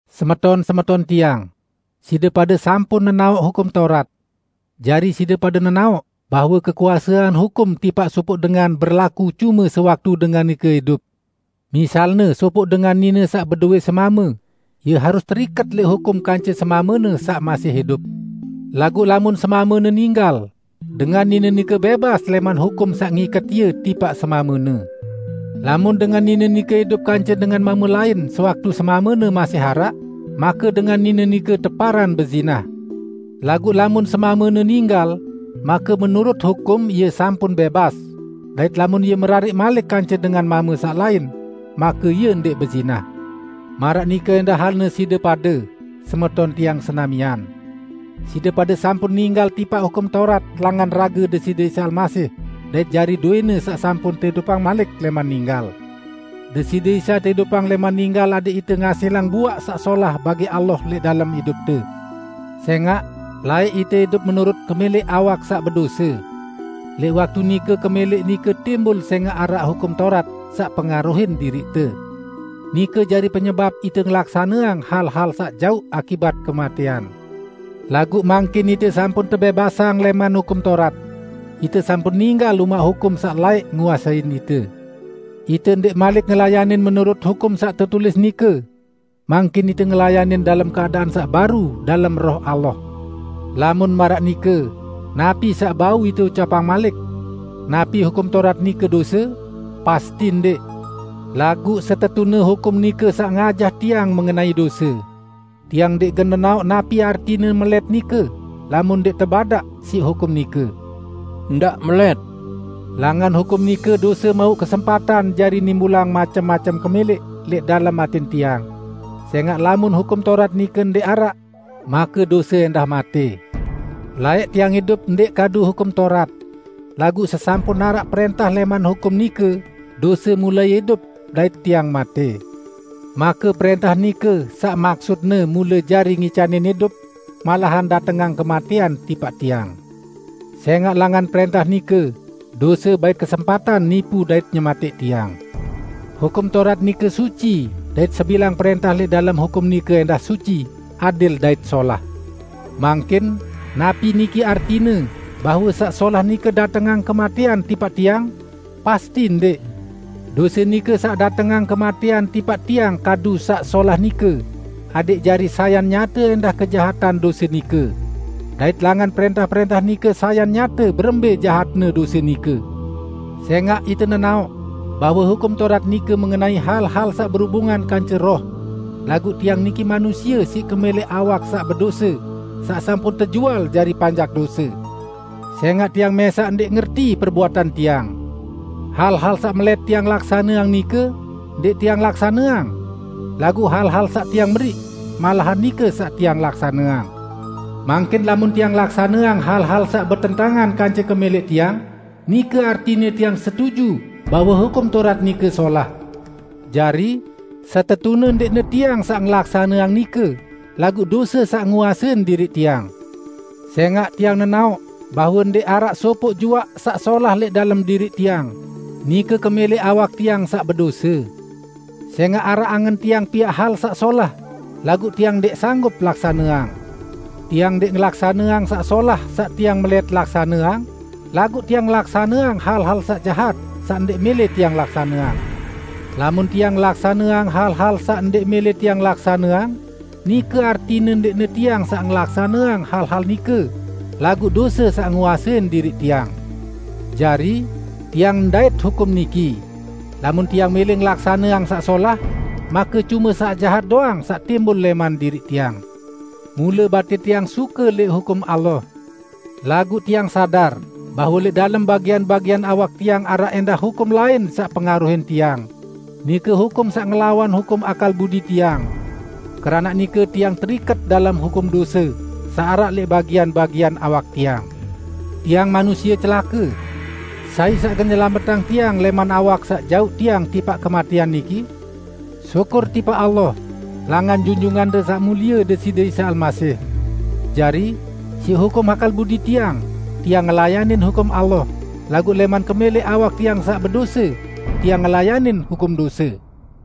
Semeton-semeton tiang! Side pade sampun nenaoq Hukum Taurat. Jari side pade nenaoq bahwe kekuasean hukum tipaq sopoq dengan berlaku cume sewaktu dengan nike idup. Misalne sopoq dengan nine saq bedowẽ semame, ie harus teriket lẽq hukum kance semamene saq masih idup. Laguq lamun semamene ninggal, dengan nine nike bẽbas lẽman hukum saq ngiket ie tipaq semamene. Lamun dengan nine nike idup kance dengan mame lain sewaktu semamene masih araq, make dengan nine nike teparan bezinah. Laguq lamun semamene ninggal, make menurut hukum ie sampun bẽbas, dait lamun ie merariq malik kance dengan mame saq lain, make ie ndẽq bezinah. Maraq nike ẽndah halne side pade, semeton tiang senamian. Side pade sampun ninggal tipaq Hukum Taurat langan rage Deside Isa Almasih dait jari dowẽ-Ne saq sampun teidupang malik lẽman ninggal. Deside Isa teidupang lẽman ninggal adẽq ite ngasilang buaq saq solah bagi Allah lẽq dalem idupte. Sẽngaq, laẽq ite idup menurut kemẽlẽq awak saq bedose. Lẽq waktu nike kemẽlẽq nike timbul sẽngaq araq Hukum Taurat saq pengaruhin diriqte. Nike jari penyebap ite ngelaksaneang hal-hal saq jauq akibat kematẽan. Laguq mangkin ite sampun tebẽbasang lẽman Hukum Taurat. Ite sampun ninggal umaq hukum saq laẽq nguasein ite. Ite ndẽq malik ngelayanin menurut hukum saq tetulis nike. Mangkin ite ngelayanin dalem keadaan saq baru dalem Roh Allah. Lamun maraq nike, napi saq bau ite ucapang malik? Napi Hukum Taurat nike dose? Pasti ndẽq! Laguq setetune hukum nike saq ngajah tiang mengenai dose. Tiang ndẽq gen nenaoq napi artine melẽt nike, lamun ndẽq tebadaq siq hukum nike, "Ndaq melẽt." Langan hukum nike, dose mauq kesempatan jari nimbulang macem-macem kemẽlẽq lẽq dalem atẽn tiang; sẽngaq lamun Hukum Taurat nike ndẽq araq, make dose ẽndah matẽ. Laẽq tiang idup ndẽq kadu Hukum Taurat. Laguq sesampun araq prẽntah lẽman hukum nike dose mulai idup dait tiang matẽ. Make prẽntah nike saq maksutne mule jari ngicanin idup malahan datengang kematẽan tipaq tiang. Sẽngaq langan prẽntah nike, dose bait kesempatan nipu dait nyematẽq tiang. Hukum Taurat nike suci dait sebilang prẽntah lẽq dalem hukum nike ẽndah suci, adil dait solah. Mangkin, napi niki artine bahwe saq solah nike datengang kematẽan tipaq tiang? Pasti ndẽq! Dose nike saq datengang kematẽan tipaq tiang kadu saq solah nike, adẽq jari sayan nyate ẽndah kejahatan dose nike. Dait langan prẽntah-prẽntah nike sayan nyate berembẽ jahatne dose nike. Sẽngaq ite nenaoq bahwe Hukum Taurat nike mengenai hal-hal saq berubungan kance roh; laguq tiang niki manusie siq kemẽlẽq awak saq bedose saq sampun tejual jari panjak dose. Sẽngaq tiang mẽsaq ndẽq ngerti perbuatan tiang. Hal-hal saq melẽt tiang laksaneang nike, ndẽq tiang laksaneang; laguq hal-hal saq tiang meriq, malahan nike saq tiang laksaneang. Mangkin lamun tiang laksaneang hal-hal saq betentangan kance kemẽlẽq tiang, nike artine tiang setuju bahwe Hukum Taurat nike solah. Jari, setetune ndẽqne tiang saq ngelaksaneang nike, laguq dose saq nguasein diriq tiang. Sẽngaq tiang nenaoq bahwe ndẽq araq sopoq juaq saq solah lẽq dalem diriq tiang; nike kemẽlẽq awak tiang saq bedose. Sẽngaq araq angen tiang piaq hal saq solah, laguq tiang ndẽq sanggup laksaneang. Tiang ndẽq ngelaksaneang saq solah saq tiang melẽt laksaneang, laguq tiang ngelaksaneang hal-hal saq jahat, saq ndẽq mẽlẽ tiang laksaneang. Lamun tiang ngelaksaneang hal-hal saq ndẽq mẽlẽ tiang laksaneang, nike artine ndẽqne tiang saq ngelaksaneang hal-hal nike, laguq dose saq nguasein diriq tiang. Jari, tiang ndait hukum niki: Lamun tiang mẽlẽ ngelaksaneang saq solah, make cume saq jahat doang saq timbul lẽman diriq tiang. Mule batin tiang suke lẽq hukum Allah, laguq tiang sadar bahwe lẽq dalem bagian-bagian awak tiang araq ẽndah hukum lain saq pengaruhin tiang -- nike hukum saq ngelawan hukum akal budi tiang. Keranaq nike tiang teriket dalem hukum dose saq araq lẽq bagian-bagian awak tiang. Tiang manusie celake! Sai saq gen nyelametang tiang lẽman awak saq jauq tiang tipaq kematẽan niki? Syukur tipaq Allah! Langan Junjungante Saq Mulie Deside Isa Almasih. Jari, siq hukum akal budi tiang, tiang ngelayanin hukum Allah, laguq lẽman kemẽlẽq awak tiang saq bedose, tiang ngelayanin hukum dose!